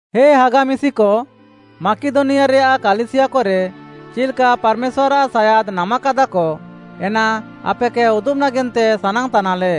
ହେ ହାଗା ମିଶିକ, ମାକିଦନିଆରେୟାଃ କାଲିସିୟାକରେ ଚିଲ୍‌କା ପାର୍‌ମେଶ୍ୱାର୍‌ଆଃ ସାୟାଦ୍‌ ନାମାକାଦାକ, ଏନା ଆପେକେ ଉଦୁବ୍‌ ନାଗେନ୍ତେ ସାନାଙ୍ଗ୍‌ତାନାଲେ।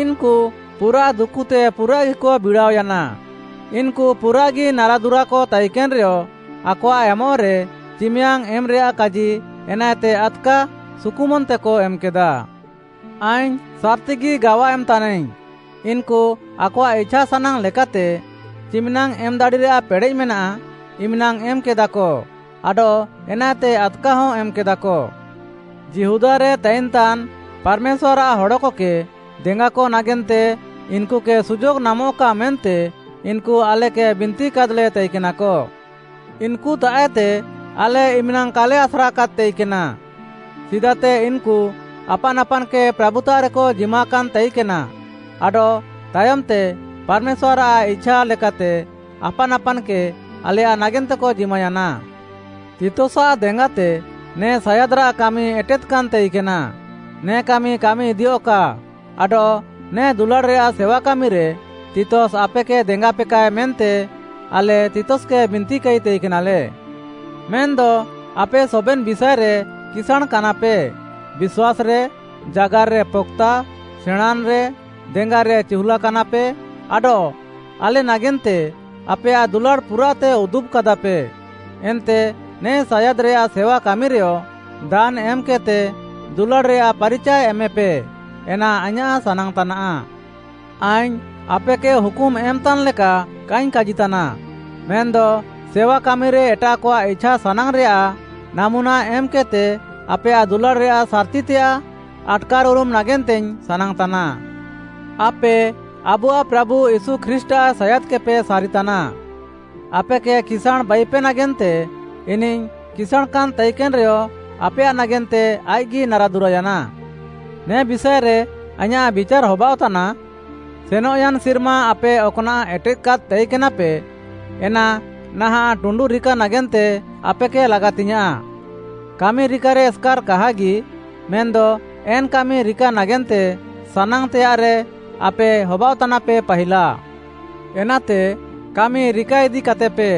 ଇନ୍‌କୁ ପୁରାଃ ଦୁକୁତେ ପୁରାଃଗିକ ବିଡ଼ାଅୟାନା। ଇନ୍‌କୁ ପୁରାଃଗି ନାରାଦୁରାକ ତାଇକେନ୍‌ରେୟ, ଆକଆଃ ଏମଃରେ, ଚିମିୟାଙ୍ଗ୍‌ ଏମ୍‌ରେୟାଃ କାଜି ଏନାଏତେ ଆଦ୍‌କା ସୁକୁମନ୍‌ତେକ ଏମ୍‌କେଦା। ଆଇଙ୍ଗ୍‌ ସାର୍‌ତିଗି ଗାୱା ଏମ୍‌ତାନାଇଙ୍ଗ୍‌, ଇନ୍‌କୁ ଆକଆଃ ଇଛାସାନାଙ୍ଗ୍‌ ଲେକାତେ ଚିମିନାଙ୍ଗ୍‌ ଏମ୍‌ ଦାଡ଼ିରେୟାଃ ପେଡ଼େଃ ମେନାଃ ଇମ୍‌ନାଙ୍ଗ୍‌ ଏମ୍‌କେଦାକ ଆଡଃ ଏନାଏତେ ଆଦ୍‌କାହଁ ଏମ୍‌କେଦାକ। ଯିହୁଦାରେ ତାଇନ୍‌ତାନ୍‌ ପାର୍‌ମେଶ୍ୱାର୍‌ଆଃ ହଡ଼କକେ ଦେଙ୍ଗାକ ନାଗେନ୍ତେ ଇନ୍‌କୁକେ ସୁଯୋଗ୍‌ ନାମଃକା ମେନ୍ତେ ଇନ୍‌କୁ ଆଲେକେ ବିନ୍ତିକାଦ୍‌ଲେ ତାଇକେନାକ। ଇନ୍‌କୁତାଃଏତେ ଆଲେ ଇମ୍‌ନାଙ୍ଗ୍‌ କାଲେ ଆସ୍ରାକାଦ୍‌ ତାଇକେନା। ସିଦାତେ ଇନ୍‌କୁ ଆପାନ୍‌ ଆପାନ୍‌କେ ପ୍ରାଭୁତାଃରେକ ଜିମାକାନ୍‌ ତାଇକେନା ଆଡଃ ତାୟମ୍‌ତେ ପାର୍‌ମେଶ୍ୱାର୍‌ଆଃ ଇଛା ଲେକାତେ ଆପାନ୍‌ ଆପାନ୍‌କେ ଆଲେୟାଃ ନାଗେନ୍ତେକ ଜିମାୟାନା। ତିତସାଃ ଦେଙ୍ଗାତେ ନେ ସାୟାଦ୍‌ରାଃ କାମି ଏଟେଦ୍‌କାନ୍‌ ତାଇକେନା। ନେ କାମି କାମିଇଦିୟଃକା ଆଡଃ ନେ ଦୁଲାଡ଼୍‌ରେୟାଃ ସେୱାକାମିରେ ତିତସ୍‌ ଆପେକେ ଦେଙ୍ଗାପେକା ମେନ୍ତେ ଆଲେ ତିତସ୍‌କେ ବିନ୍ତିକାଇ ତାଇକେନାଲେ। ମେନ୍‌ଦ ଆପେ ସବେନ୍‌ ବିଷାଏରେ କିସାଁଣ୍‌କାନାପେ, ବିଶ୍ୱାସ୍‌ରେ, ଜାଗାର୍‌ରେ ପକ୍‌ତା, ସେଣାଁଁନ୍‌ରେ, ଦେଙ୍ଗାରେ ଚିହୁଲାକାନାପେ, ଆଡଃ ଆଲେ ନାଗେନ୍ତେ ଆପେୟାଃ ଦୁଲାଡ଼୍‌ ପୁରାଃତେ ଉଦୁବ୍‌କାଦାପେ। ଏନ୍ତେ ନେ ସାୟାଦ୍‌ରେୟାଃ ସେୱାକାମିରେୟ ଦାନ୍‌ ଏମ୍‌କେଦ୍‌ତେ ଦୁଲାଡ଼୍‌ରେୟାଃ ପାରିଚାଏ ଏମେପେ, ଏନା ଆଇଁୟାଃ ସାନାଙ୍ଗ୍‌ତାନାଃ। ଆଇଙ୍ଗ୍‌ ଆପେକେ ହୁକୁମ୍‌ ଏମ୍‌ତାନ୍‌ ଲେକା କାଇଙ୍ଗ୍‌ କାଜିତାନା, ମେନ୍‌ଦ ସେୱାକାମିରେ ଏଟାଃକଆଃ ଇଛାସାନାଙ୍ଗ୍‌ରେୟାଃ ନାମୁନା ଏମ୍‌କେଦ୍‌ତେ ଆପେୟାଃ ଦୁଲାଡ଼୍‌ରେୟାଃ ସାର୍‌ତିତେୟାଃ ଆଟ୍‌କାର୍‌ଉରୁମ୍‌ ନାଗେନ୍ତେଇଙ୍ଗ୍‌ ସାନାଙ୍ଗ୍‌ତାନା। ଆପେ ଆବୁଆଃ ପ୍ରାଭୁ ୟୀଶୁ ଖ୍ରୀଷ୍ଟ୍‌ଆଃ ସାୟାଦ୍‌କେପେ ସାରିତାନା। ଆପେକେ କିସାଁଣ୍‌ ବାଇପେ ନାଗେନ୍ତେ, ଇନିଃ କିସାଁଣ୍‌ ତାଇକେନ୍‌ରେୟ, ଆପେୟାଃ ନାଗେନ୍ତେ ଆଇଃକ୍‌ଗି ନାରାଦୁରାୟାନା। ନେ ବିଷାଏରେ ଆଇଁୟାଃ ବିଚାର୍‌ ହବାଅଃତାନା, ସେନଃୟାନ୍‌ ସିର୍ମା ଆପେ ଅକ୍‌ନାଃ ଏଟେଦ୍‌କାଦ୍‌ ତାଇକେନାପେ, ଏନା ନାହାଁଃ ଟୁଣ୍ଡୁ ରିକା ନାଗେନ୍ତେ ଆପେକେ ଲାଗାତିଙ୍ଗ୍‌ୟାଁଃ। କାମି ରିକାରେ ଏସ୍‌କାର୍‌ କାହାଗି, ମେନ୍‌ଦ ଏନ୍‌ କାମି ରିକା ନାଗେନ୍ତେ ସାନାଙ୍ଗ୍‌ତେୟାଃରେ ଆପେ ହବାଅଃତାନାପେ ପାହିଲା। ଏନାତେ କାମି ରିକାଇଦିକାତେପେ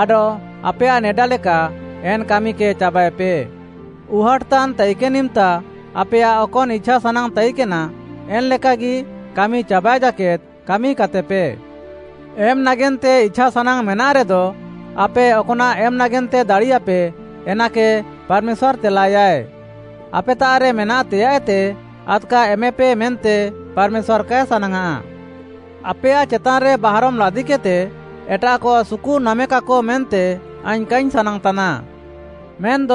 ଆଡଃ ଆପେୟାଃ ନେଡାଲେକା ଏନ୍‌ କାମିକେ ଚାବାଏପେ। ଉହାଟ୍‌ତାନ୍‌ ତାଇକେନ୍‌ ଇମ୍‌ତା ଆପେୟାଃ ଅକନ୍‌ ଇଛାସାନାଙ୍ଗ୍‌ ତାଇକେନା, ଏନ୍‌ ଲେକାଗି କାମି ଚାବାଏ ଜାକେଦ୍‌ କାମିକାତେପେ। ଏମ୍‌ ନାଗେନ୍ତେ ଇଛାସାନାଙ୍ଗ୍‌ ମେନାଃରେଦ, ଆପେ ଅକ୍‌ନାଃ ଏମ୍‌ ନାଗେନ୍ତେ ଦାଡ଼ିୟାପେ, ଏନାକେ ପାର୍‌ମେଶ୍ୱାର୍‌ ତେଲାଏୟାଏ। ଆପେତାଃରେ ମେନାତେୟାଃଏତେ ଆଦ୍‌କା ଏମେପେ ମେନ୍ତେ ପାର୍‌ମେଶ୍ୱାର୍‌ କାଏ ସାନାଙ୍ଗ୍‌ଆଃ। ଆପେୟାଃ ଚେତାନ୍‌ରେ ବାହାରମ୍‌ ଲାଦିକେଦ୍‌ତେ, ଏଟାଃକ ସୁକୁ ନାମେକାକ ମେନ୍ତେ ଆଇଙ୍ଗ୍‌ କାଇଙ୍ଗ୍‌ ସାନାଙ୍ଗ୍‌ତାନା। ମେନ୍‌ଦ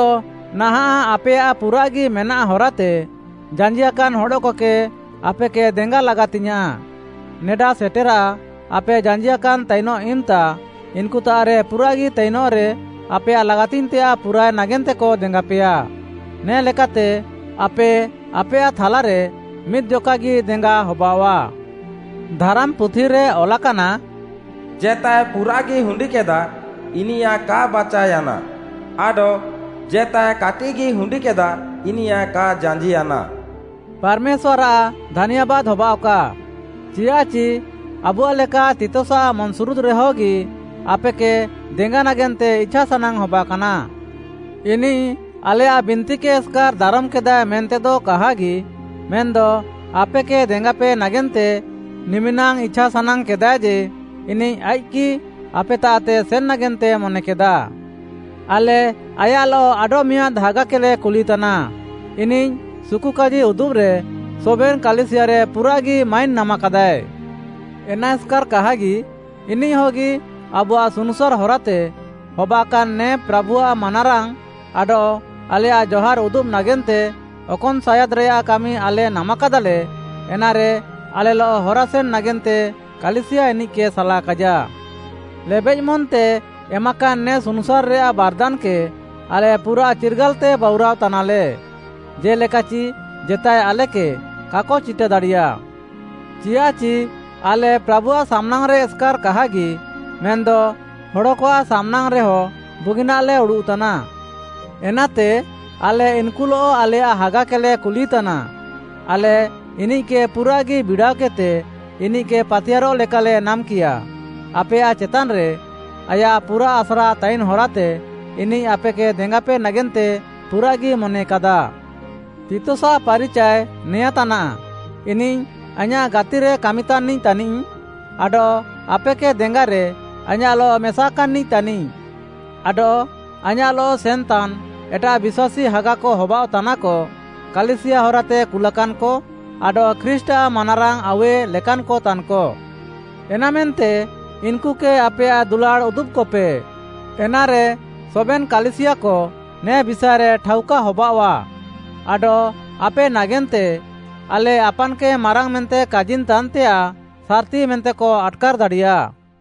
ନାହାଁଃ ଆପେୟାଃ ପୁରାଃଗି ମେନାଃ ହରାତେ, ଜାଞ୍ଜିଆକାନ୍‌ ହଡ଼କକେ ଆପେକେ ଦେଙ୍ଗା ଲାଗାତିଙ୍ଗ୍‌ୟାଁଃ। ନେଡା ସେଟେରା, ଆପେ ଜାଞ୍ଜିଆକାନ୍‌ ତାଇନଃ ଇମ୍‌ତା, ଇନ୍‌କୁତାଃରେ ପୁରାଃଗି ତାଇନଃରେ ଆପେୟାଃ ଲାଗାତିଙ୍ଗ୍‌ତେୟାଃ ପୁରାଏ ନାଗେନ୍ତେକ ଦେଙ୍ଗାପେୟା। ନେ ଲେକାତେ ଆପେ, ଆପେୟାଃ ଥାଲାରେ ମିଦ୍‌ଜକାଗି ଦେଙ୍ଗା ହବାଅଃଆ। ଧାରାମ୍‌ପୁଥିରେ ଅଲାକାନା, “ଜେତାଏ ପୁରାଃଗି ହୁଣ୍ଡିକେଦା, ଇନିୟାଃ କା ବାଚାଅୟାନା, ଆଡଃ ଜେତାଏ କାଟିଃଗି ହୁଣ୍ଡିକେଦା, ଇନିୟାଃ କା ଜାଞ୍ଜିୟାନା।” ପାର୍‌ମେଶ୍ୱାର୍‌ଆଃ ଧାନ୍ୟାବାଦ୍‌ ହବାଅଃକା, ଚିୟାଃଚି ଆବୁଆଃ ଲେକା ତିତସ୍‌ଆଃ ମନ୍‌ସୁରୁଦ୍‌ରେ ହଗି ଆପେକେ ଦେଙ୍ଗା ନାଗେନ୍ତେ ଇଛାସାନାଙ୍ଗ୍‌ ହବାକାନା। ଇନିଃ ଆଲେୟାଃ ବିନ୍ତିକେ ଏସ୍‌କାର୍‌ ଦାରମ୍‌କେଦାଏ ମେନ୍ତେଦ କାହାଗି, ମେନ୍‌ଦ ଆପେକେ ଦେଙ୍ଗାପେ ନାଗେନ୍ତେ ନିମିନାଙ୍ଗ୍‌ ଇଛାସାନାଙ୍ଗ୍‌ କେଦାଏ ଯେ, ଇନିଃ ଆଇଃକ୍‌ଗି ଆପେତାଃତେ ସେନ୍‌ ନାଗେନ୍ତେ ମନେକେଦାଏ। ଆଲେ ଆୟାଃଲଃ ଆଡଃମିଆଁଦ୍‌ ହାଗାକେଲେ କୁଲିତାନା। ଇନିଃ ସୁକୁକାଜି ଉଦୁବ୍‌ରେ ସବେନ୍‌ କାଲିସିୟାରେ ପୁରାଃଗି ମାଇନ୍‌ ନାମାକାଦାଏ। ଏନା ଏସ୍‌କାର୍‌ କାହାଗି, ଇନିଃ ହଗି ଆବୁଆଃ ସୁନୁସାର୍‌ ହରାତେ ହବାକାନ୍‌ ନେ ପ୍ରାଭୁଆଃ ମାନାରାଙ୍ଗ୍‌ ଆଡଃ ଆଲେୟାଃ ଜହାର୍‌ ଉଦୁବ୍‌ ନାଗେନ୍ତେ ଅକନ୍‌ ସାୟାଦ୍‌ରେୟାଃ କାମି ଆଲେ ନାମାକାଦାଲେ, ଏନାରେ ଆଲେଲଃ ହରାସେନ୍‌ ନାଗେନ୍ତେ କାଲିସିୟା ଇନିଃକେ ସାଲାକାଇଜା। ଲେବେଃ ମନ୍‌ତେ ଏମାକାନ୍‌ ନେ ସୁନୁସାର୍‌ରେୟାଃ ବାର୍‌ଦାନ୍‌କେ ଆଲେ ପୁରାଃ ଚିର୍ଗାଲ୍‌ତେ ବାଉରାଅ ତାନାଲେ, ଜେ'ଲେକାଚି ଜେତାଏ ଆଲେକେ କାକ ଚିଟା ଦାଡ଼ିୟା। ଚିୟାଃଚି ଆଲେ ପ୍ରାଭୁଆଃ ସାମ୍‌ନାଙ୍ଗ୍‌ରେ ଏସ୍‌କାର୍‌ କାହାଗି ମେନ୍‌ଦ ହଡ଼କଆଃ ସାମ୍‌ନାଙ୍ଗ୍‌ରେହ ବୁଗିନାଃଲେ ଉଡ଼ୁଃତାନା। ଏନାତେ ଆଲେ ଇନ୍‌କୁଲଃ ଆଲେୟାଃ ହାଗାକେଲେ କୁଲିତାନା। ଆଲେ ଇନିଃକେ ପୁରାଃଗି ବିଡ଼ାଅକେଦ୍‌ତେ ଇନିଃକେ ପାତିୟାର୍‌ରଃ ଲେକାଲେ ନାମ୍‌କିୟା। ଆପେୟାଃ ଚେତାନ୍‌ରେ ଆୟାଃ ପୁରାଃ ଆସ୍ରା ତାଇନ୍‌ ହରାତେ, ଇନିଃ ଆପେକେ ଦେଙ୍ଗାପେ ନାଗେନ୍ତେ ପୁରାଃଗି ମନେକାଦା। ତିତସ୍‌ଆଃ ପାରିଚାଏ ନେଆଁଁତାନାଃ, ଇନିଃ ଆଇଁୟାଃ ଗାତିରେ କାମିତାନ୍‌ନିଃ ତାନିଃ ଆଡଃ ଆପେକେ ଦେଙ୍ଗାରେ ଆଇଁୟାଃଲଃ ମେସାକାନ୍‌ନିଃ ତାନିଃ। ଆଡଃ ଆଇଁୟାଃଲଃ ସେନ୍‌ତାନ୍‌ ଏଟାଃ ବିଶ୍ୱାସୀ ହାଗାକ ହବାଅଃତାନାକ: କାଲିସିୟା ହରାତେ କୁଲାକାନ୍‌କ ଆଡଃ ଖ୍ରୀଷ୍ଟ୍‌ଆଃ ମାନାରାଙ୍ଗ୍‌ ଆଉୱେ ଲେକାନ୍‌କ ତାନ୍‌କ। ଏନାମେନ୍ତେ, ଇନ୍‌କୁକେ ଆପେୟାଃ ଦୁଲାଡ଼୍‌ ଉଦୁବ୍‌କପେ। ଏନାରେ ସବେନ୍‌ କାଲିସିୟାକ ନେ ବିଷାଏରେ ଠାଉକା ହବାଅଃଆ ଆଡଃ ଆପେ ନାଗେନ୍ତେ ଆଲେ ଆପାନ୍‌କେ ମାରାଙ୍ଗ୍‌ ମେନ୍ତେ କାଜିନ୍‌ତାନ୍‌ତେୟାଃ ସାର୍‌ତି ମେନ୍ତେକ ଆଟ୍‌କାର୍‌ ଦାଡ଼ିୟା।